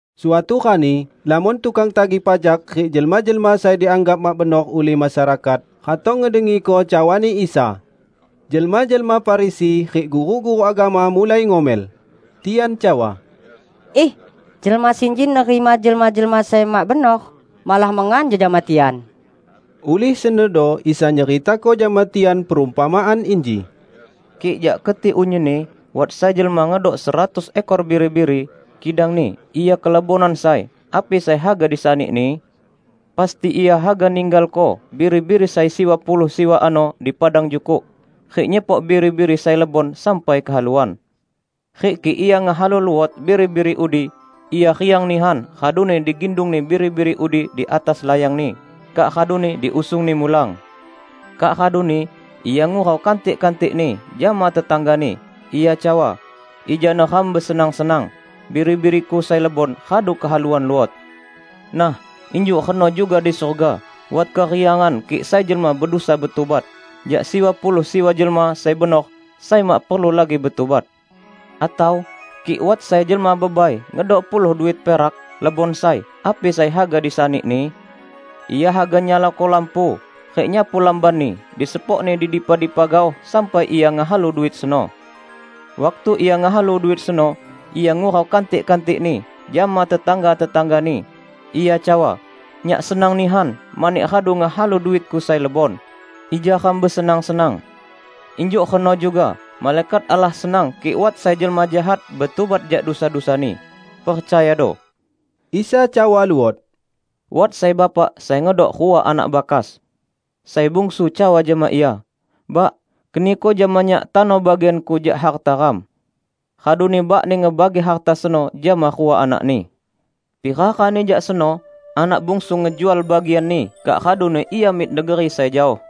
Suatu rani, lamon tukang tagih pajak rik jelma-jelma sai dianggap mak benor ulih masyarakat, ratong ngedengiko cawani Isa. Jelma-jelma Farisi rik guru-guru agama mulai ngomel. Tian cawa, "Iih, jelma sinji nerima jelma-jelma sai mak benor malah mengan jejama tian!" Ulih senodo Isa nyeritako jama tian perumpamaan inji, "Kik jak keti unyinni wat sai jelma ngedok seratus ekor biri-biri, kidangni ia kelebonan sai -- api sai haga disanini? Pasti ia haga ninggalko biri-biri sai siwa puluh siwa ano di padang jukuk, rik nyepok biri-biri sai lebon sampai kehaluan. Rik kik ia ngehalu luot biri-biri udi, ia riang nihan raduni digindungni biri-biri udi di atas di layangni, kak raduni diusungni mulang. Kak raduni ia ngurau kantik-kantikni jama tetanggani, ia cawa, 'Ija neram besenang-senang. Biri-biriku sai lebon radu kehaluan luot!' Nah, injuk reno juga di surga wat keriangan kik sai jelma bedusa betubat, jak siwa puluh siwa jelma sai benor sai mak perlu lagi betubat." "Atau kik wat sai jelma bebai ngedok puluh duit perak, lebon sai -- api sai haga disanini? Ia haga nyalako lampu rik nyapu lambanni disepokni di dipa-dipa gaoh sampai ia ngehalu duit seno. Waktu ia ngehalu duit seno, ia ngurau kantik-kantikni jama tetangga-tetanggani, ia cawa, 'Nyak senang nihan mani radu ngehalu duitku sai lebon. Ija ram besenang-senang!' Injuk reno juga malaikat Allah senang kik wat sai jelma jahat betubat jak dusa-dusani. Percayado!" Isa cawa luot, "Wat sai bapak sai ngedok rua anak bakas. Sai bungsu cawa jama ia, 'Bak, keniko jama nyak tano bagianku jak harta ram.' Raduni bakni ngebagi harta seno jama rua anakni. Pira rani jak seno anak bungsu ngejual bagianni kak raduni ia mik negeri sai jaoh.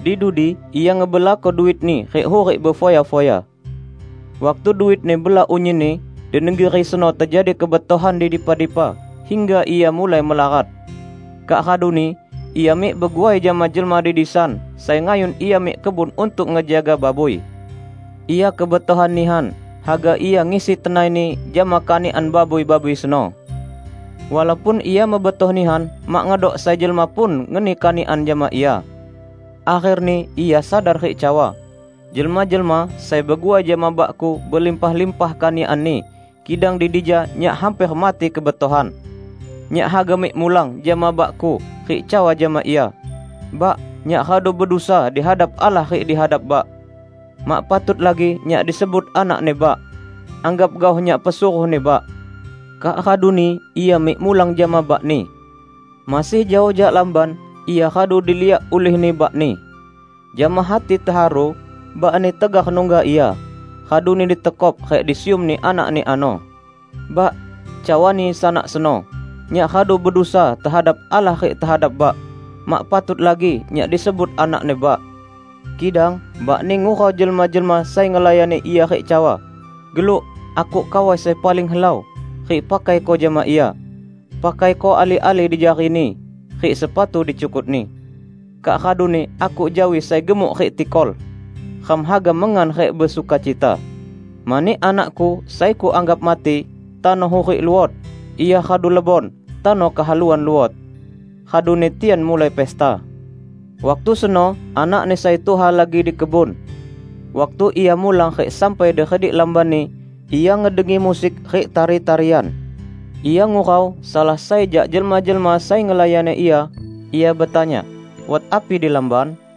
Di dudi ia ngebelako duitni rik hurik befoya-foya. Waktu duitni bela unyinni, di negeri seno tejadi kebetohan di dipa-dipa, hingga ia mulai melarat. Kak raduni ia mik beguai jama jelma di disan sai ngayun ia mik kebun untuk ngejaga babui. Ia kebetohan nihan haga ia ngisi tenaini jama kanikan babui-babui seno. Walaupun ia mebetoh nihan mak ngedok sai jelma pun ngeni kanikan jama ia. Akherni ia sadar rik cawa, 'Jelma-jelma sai beguai jama bakku belimpah-limpah kanikanni kidang di dija nyak hamper mati kebetohan! Nyak haga mik mulang jama bakku, rik cawa jama ia: Bak, nyak radu bedusa di hadap Allah rik di hadap Bak. Mak patut lagi nyak disebut anakni Bak. Anggap gaoh nyak pesuruhni Bak.' Kak raduni ia mik mulang jama bakni. Masih jaoh jak lamban, ia radu diliak ulihni bakni. Jama hati teharu bakni tegar nungga ia, raduni ditekop rik disiumni anakni ano. 'Bak,' cawani sanak seno, 'nyak radu bedusa tehadap Allah rik tehadap Bak. Mak patut lagi nyak disebut anakni Bak.' Kidang bakni ngurau jelma-jelma sai ngelayani ia rik cawa, 'Geluk! Akuk kawai sai paling helau, rik pakaiko jama ia. Pakaiko ali-ali dijarini, rik sepatu dicukutni. Kak raduni akuk jawi sai gemuk rik tikol. Ram haga mengan rik besukacita. Mani anakku sai kuanggap mati, tano hurik luot; ia radu lebon, tano kehaluan luot.' Raduni tian mulai pesta. Waktu seno, anakni sai tuha lagi di kebun. Waktu ia mulang rik sampai di redik lambanni, ia ngedengi musik rik tari-tarian. Ia ngurau salah sai jak jelma-jelma sai ngelayani ia, ia betanya, 'Wat api di lamban?'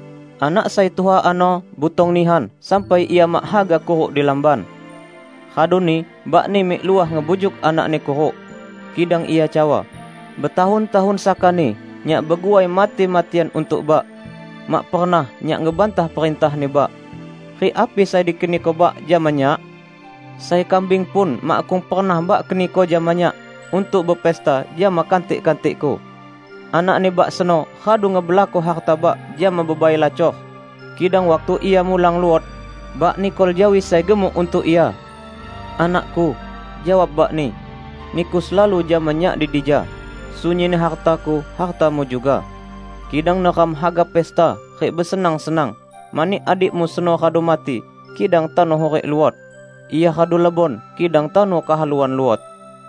Anak sai tuha ano butong nihan sampai ia mak haga kuruk di lamban. Raduni bakni mik luah ngebujuk anakni kuruk. Kidang ia cawa, 'Betahun-tahun sakani nyak beguai mati-matian untuk Bak. Mak pernah nyak ngebantah perintahni Bak. Rik api sai dikeniko bak jama nyak? Sai kambing pun makkung pernah Bak keniko jama nyak untuk bepesta jama kantik-kantikku! Anakni Bak seno radu ngebelako hartani Bak jama bebai lacor, kidang waktu ia mulang luot, Bak nikol jawi sai gemuk untuk ia!' 'Anakku,' jawab bakni, 'niku selalu jama nyak di dija. Sunyinni hartaku hartamu juga. Kidang neram haga pesta rik besenang-senang, mani adikmu seno radu mati, kidang tano hurik luot; ia radu lebon, kidang tano kehaluan luot.' "